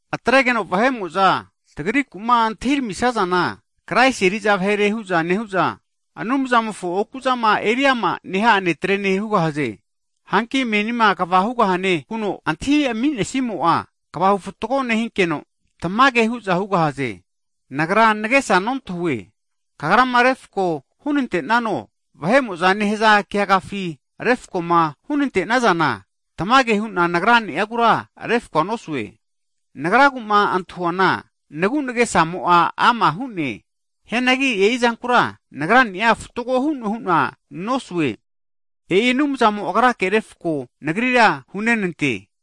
Atregeno vahe'mo'za tagriku'ma antahi ramisazana, Kraisi eriza vahere hu'za nehu'za, Anumzamofo oku'zama eri ama neha'a netre'ne hugahaze. Hanki menima kva hugahane huno antahi ami'nesimo'a, kvahu fatgo nehinkeno, tamage hu'za hugahaze. Nagra nagesa nontahue, Kagrama refko hunante'nano, vahe'mo'za nehaza keagafi (kot) refako'ma hunante'nazana, tamage hu'na nagra'agura refko nosue. Nagragu'ma antahuana nagu nagesamo'a ama hu'ne, hianagi e'izankura nagra'niagura fatgo hu'noe hu'na nosue. E'i Anumzamo Agrake refko nagrira hunantegahie.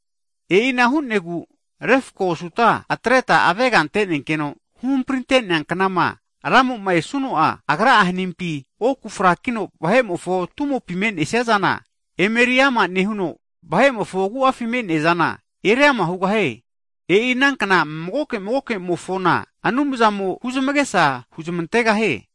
E'ina hu'negu refko osuta atreta avega ante'nenkeno, huhamprinte'nea knama Ramo'ma esuno'a, Agra hanimpi oku'a frakino vahe'mofo tumopi me'neasizana, emeri ama nehuno, vahe'mofo agu'afi me'nesiazana eriama hugahie. E'i anankna magoke magoke'mofona, Anumzamo huzmasga huzmantegahie.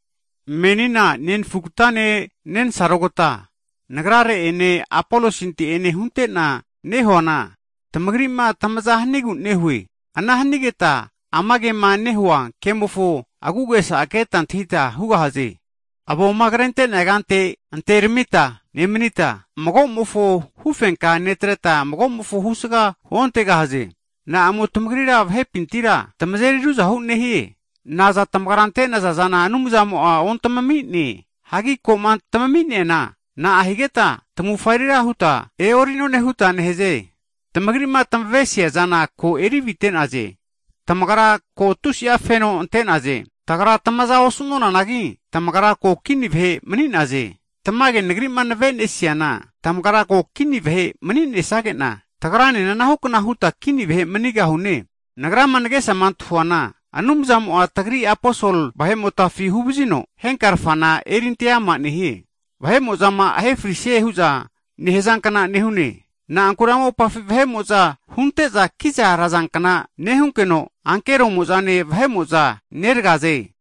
Menina nenfugatane nensarogata nagrare' ene Apolosinte'ene huntena nehuana, tamagri'ma tamaza hanigu nehue. Ana hanigeta ama kema nehu'a kemofo agu'agesa keta antahita hugahaze. Avoma krente'nea kante anteramita nemanita, mago'mofo hufenkami netreta, magomofo husga huontegahaze. Na'amo vahepintira tamagrira tamazeri ruzahura nehie? Naza tamagra ante'naza zana Anumzamo'a, ontami'ne? Hagi koma tamimi'neana, na'a higeta tamufa erira huta e'ori'none huta nehaze? Tamagri'ma tamesiazana ko eri avite'naze! Tamagra ko tusi'a feno ante'naze. Tagra tamaza osu'nonanagi, tamagra ko kini vahe mani'naze! Tamage nagri'ma navenesiana, tamagra ko kini vahe mani'nesage'na, tagranena anahukna huta kini vahe manigahune. Nagrama nagesama antahuana, Anumzamo'a tagri Aposol vahe'motafi huvazino, henkarfana erinte ama nehie. Vahe'mo'zama ahefrisie hu'za nehazankna nehune, na'ankure ama mopafi vahe'mo'za hunte'za kiza razankna nehunkeno, ankeromo'zane vahe'mo'za neragaze.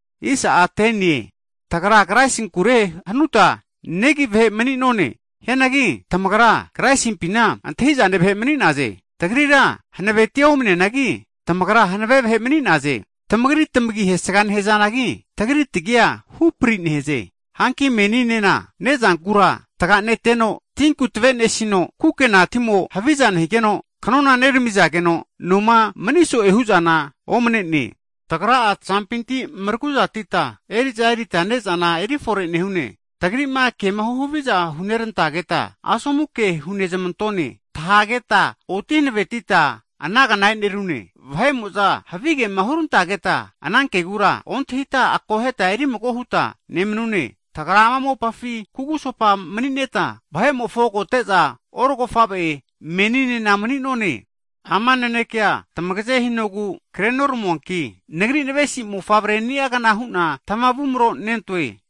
Tagra Kraisi agimo'ma mareriniazanku negi vahe mani'none, hianagi tamagra Kraisimpina antahi'zane vahe mani'naze! Tagrira hanavetia omneanagi, tamagra hanave vahe mani'naze! Tamagri tmagi hesga nehazanagi, tagrira tagi hupri nehaze. Hanki meninena, ne'zankura tga'neteno, tinku tave nesino, kukena timo haviza nehigeno, knona neramizageno, noma mani so'e hu'zana nomne. Tagra'a tazampinti mraguzatita, eri'za erita ne'zana erifore nehune. Tagri'ma kema huhaviza hurantageta, asomu ke hunezmantone, tahageta oti hanavetita anagna e'nerune. Vahe'mo'za havigema hurantageta, anankegura ontahita akoheta eri mago huta nemanune, tagra ama mopamofo kugusopa manineta, vahe'mofo agote'za orogofavegna huta meninena mani'none. Ama nanekea, tamagaze hinogu kre'noramuanki, nagra navesinentoa mofavre ni'agna hu'na tamavumro nentoe.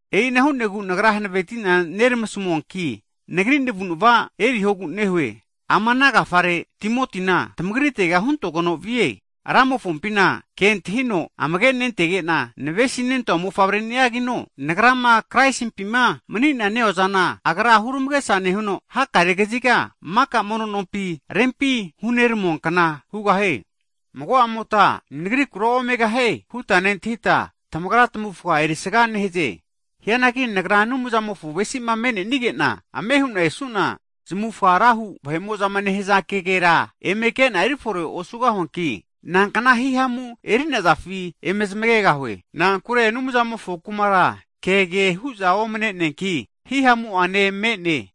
E'ina hu'negu nagra huhanveti'na nermasamuanki, nagri navu'nava eriho. Ama ana agafare Timotina tamagritega huntogeno vie. Ramofompina kentahino amage nentege'na navesinentoa mofavre ni'agino, agra nagrama Kraisimpima mani'na neozana huramagesa nehuno, hakare kaziga maka mono nompi rempima hunermuankna hugahie. Mago'a mota nagrikura, Omegahie huta nentahita, tamagra tmavufga erisaga nehaze. Hianagi nagra Anumzamofo ave'sizama me'nenige'na ame hu'na esu'na, zamufga rahu vahe'mo'zama nehza kegera eme ke'na eri fore osugahuanki, nankna himamu eri'nazafi eme zmagegahue. Na'ankure Anumzamofo Kumara kege hu'za omne'neanki, hihamu'ane hanave'a me'ne.